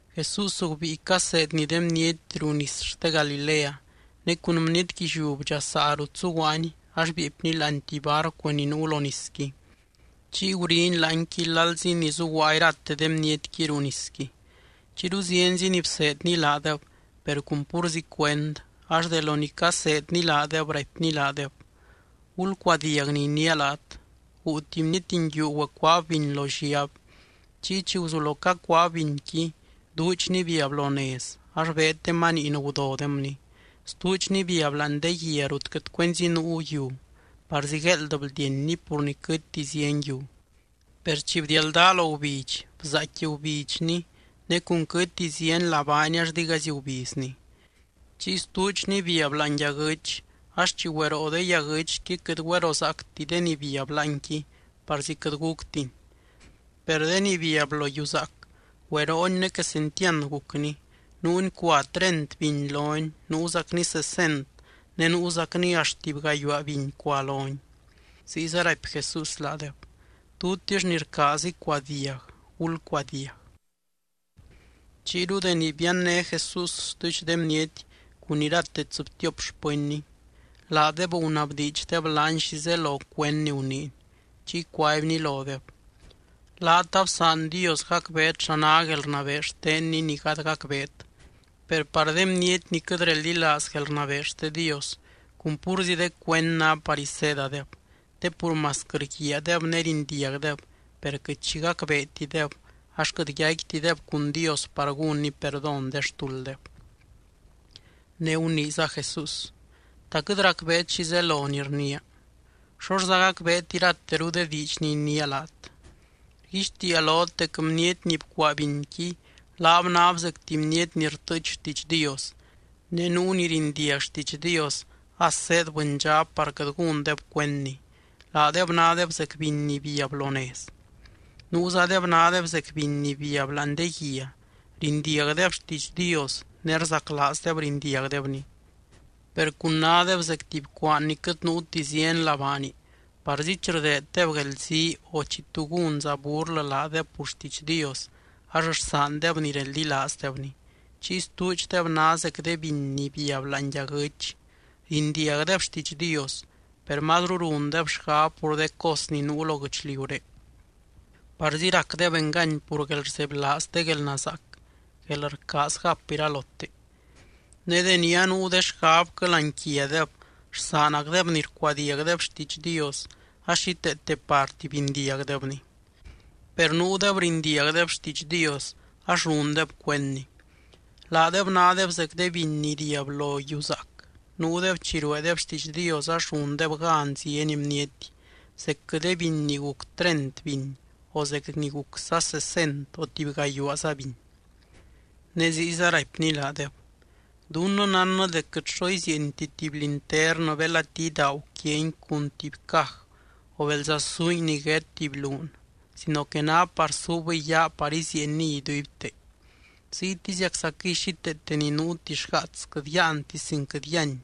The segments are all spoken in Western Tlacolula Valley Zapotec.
Jesús gubíi caseedny de bniety ruu nis xte Galilea. Ne cun bniety guilliú bdxasaa rut zuguaany ax bieepny láani tuby barcu ni nuu lo nisqui, chiy guriny láanqui lalzi ni zuguaa irate de bnietqui ruu nisqui. Chiyru zienzi ni bseedny laadeb, per cun púrzi cuend, ax de lo ni caseedny laadeb, raipny laadeb: —Gulcuadiag ni iniia laat. Guu tuby bniety nguiu güecuaab biny lo lliab. Chiy chi guzulo cacuaab binqui, duudxni biab lo nez ax beed de maniin gudodemni. Stuudxni biab láani de guia rut quɨt cuenzi nuu yiu, parzi gueeld bldienni pur ni quɨtti zieny yiu. Per chi bdialdaa lo gubidx, bzaaicqui gubidxni, ne cun quɨtti zieny labaani ax digaizy gubizni. Chiy stuudxni biab láani yaguɨ́ch. Ax chi güeroo de yaguɨ́chqui quɨt güerozaacti de ni biab láanqui, parzi quɨt guctini. Per de ni biab lo yiu zaac, güerooni ne quesentiand gucni. Nuuni cua treint biny loni, nuuzacni sesent ne nuuzacni axt tuby gayuaa biny cua loni. Ziyza raipy Jesús laadeb: —Tutix ni rcaaz icuadiag, gulcuadiag. Chiyru deni bianné Jesús stuudx de bniety cun irate tsɨbtiop xpɨnny, laadeb gunabdiidxdeb laany xi zelo cuend ni guniiny. Chiy cuaibny lodeb: —Laat absaan Dios gacbeet xa ná guelrnabee xtenny ni gady gacbeet. Per par de bniety ni quɨt reldilaaz guelrnabee xte Dios, cun púrzi de cuend ná par iseedadeb. Te pur masquɨ rguiaadeb ne rindiagdeb, per quɨt xi gacbeetideb ax quɨt yaicquitideb cun Dios par gúnny perdón de xtulddeb. Ne guniiza Jesús: —¿Ta quɨt racbeet xi zelo ni rniia? ¿Xoxza gacbeet irateru de diidx ni iniia laat? Rguixtiia lot dec bniety ni bcuaa binqui, laab náb zec tuby bniety ni rtɨɨch xtiidx Dios. Ne nuu ni rindiag xtiidx Dios as zéed bɨndxab par quɨt gúndeb cuendni. Laadeb nádeb zec biny ni biab lo nez. Nuuzadeb nádeb zec biny ni biab láani de guia. Rindiagdeb xtiidx Dios ne rzaclaazdeb rindiagdebni. Per cun nádeb zec tuby cuaan ni quɨt nuuti zieny labaani, parzi chi rdeeddeb guelzii o chi tu gúnza burlɨ laadeb pur xtiidx Dios ax rsaandeb ni reldilaazdebni. Chiy stuudxdeb ná zec de biny ni biab láani yaguɨ́ch. Rindiagdeb xtiidx Dios, per mazru rundeb xgab pur de cos ni nuu lo guɨchliuré. Parzi racdeb engany pur guelrzebylaaz de guelnazaac, guelrcaaz gap iralote. Ne deni anuu de xgabquɨ láani quiadeb rsaanacdeb ni rcuadiagdeb xtiidx Dios ax xíteete parti bindiagdebni. Per nuudeb rindiagdeb xtiidx Dios ax rundeb cuendni. Laadeb nádeb zec de biny ni riab lo yiu zaac. Nuudeb chi rueedeb xtiidx Dios ax rundeb gan zieny bniety, zecquɨ de biny ni guc treint biny o zec ni gucza sesent o tuby gayuaaza biny. Ne ziyza raipny laadeb: —Dunnɨ nánnɨ dec quɨt xo izieenti tuby linternɨ belati idaagu quiangui cun tuby caj, o belza suingui niguét tuby luun sino que ná par suubɨy yaa par izieenniy iduibte. Ziytiziaczaquɨy xíteete ni nuuti xgaats quɨt yáanti sin quɨt yíany,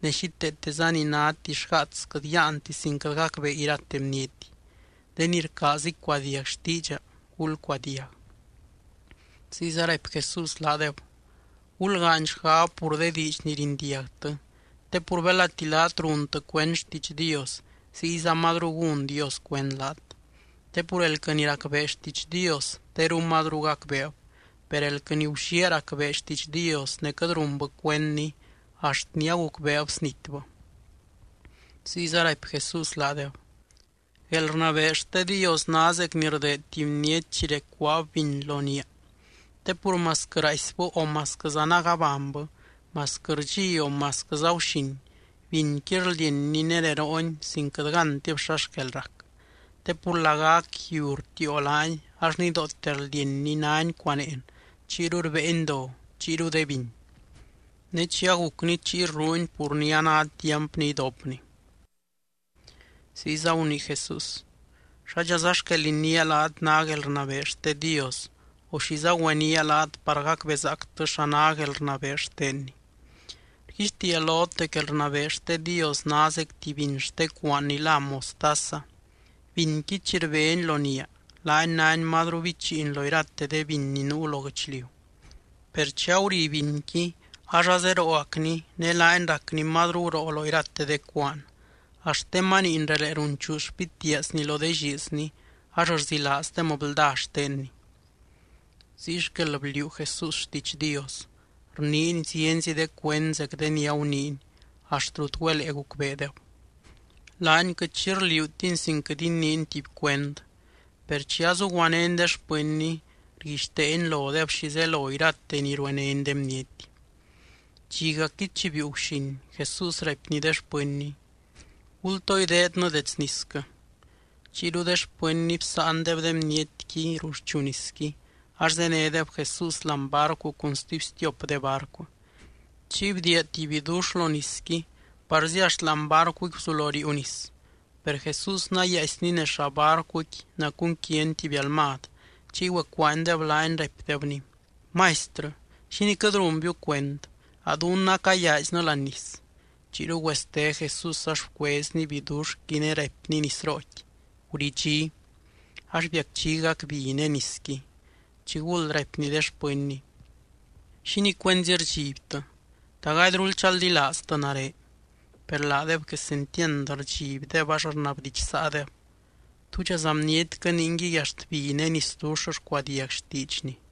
ne xíteeteza ni náti xgaats quɨt yáanti sin quɨt gacbee irate bniety. De ni rcaaz icuadiag xtiidxa, gulcuadiag. Ziyza raipy Jesús laadeb: —Gulgaany xgab pur de diidx ni rindiagtɨ. Te pur belati laat runtɨ cuend xtiidx Dios, ziyza mazru gún Dios cuend laat. Te pur elquɨ ni racbee xtiidx Dios teru mazru gacbeeb. Per elquɨ ni gulliaa racbee xtiidx Dios ne quɨt runbɨ cuendni, axt ni agucbeeb snitbɨ. Ziyza raipy Jesús laadeb: —Guelrnabee xte Dios ná zec ni rdeed tuby bniety chi recuaab biny lo niaa. Te pur masquɨ raaisbɨ o masquɨza nagabanybɨ, masquɨ rdxi o masquɨza guxin, binqui rldienni ne rerooni sin quɨt gántib xa xquel rac. Te pur lagac yiu rtiio laani ax nidoote rldienni náni cuaneen, chiyru rbéeni do, chiyru de biny. Ne chi agucni chiy rruuni pur ni a ná tiamp ni idopni. Ziyza gunii Jesús: —¿Xádxaza xquel iniia laat ná guelrnabee xte Dios, o xiza güeniaa laat par gacbezaactɨ xa ná guelrnabee xtenny? Rguixtiia lot dec guelrnabee xte Dios ná zec tuby biny xte cuaan ni lá mostaza. Binqui chi rbeni lo niaa, laani náni mazru bichiin lo irate de biny ni nuu lo guɨchliu. Per chi aguri binqui ax azerooacni ne laani racni mazru guroo lo irate de cuaan, axt de maniin relee runchuu xpitiaazni lo de lliizni ax rzilaazdem blda xtenni. Ziy xquel bliuu Jesús xtiidx Dios. Rniiny zienzi de cuend zec de ni aguniiny, axt rut güelee gucbeedeb. Laany quɨt xi rliuutiny sin quɨt iniiny tuby cuend. Per chi azuguanény de xpɨnny, rguixteeny lodeb xi zelo irate ni ruenény de bniety. Dxigacqui chi biiu guxin, Jesús raipny de xpɨnny: —Gultoo ideednɨ dets nisquɨ. Chiyru de xpɨnny bsáandeb de bnietqui ruxchu nisqui, ax zénedeb Jesús láani barcuqui cun stuby stiop de barcu. Chiy bdiia tuby bidux lo nisqui parzi axt láani barcuqui guzulo riiu nis. Per Jesús nayaaisny nez llaa barcuqui nacunquiany tuby almad. Chiy güecuaanydeb laany, raipdebny: —¡Maistrɨ! ¿Xínii quɨt runbiu cuend? A dunnɨ acayaaiznɨ láani nis. Chiyru güeste Jesús ax bcuezny biduxqui ne raipny nisrooqui: —¡Guridxí! Ax biacdxigac bi ne nisqui. Chiguld raipny de xpɨnny: —¿Xínii cuenzi rdxibtɨ? ¿Ta gadyrul chaldilaaztɨ nare? Per laadeb quesentiand rdxibdeb ax rnabdidxsaadeb: —¿Túdxaza bnietquɨ ningui axt bi ne nisdux rcuadiag xtiidxny?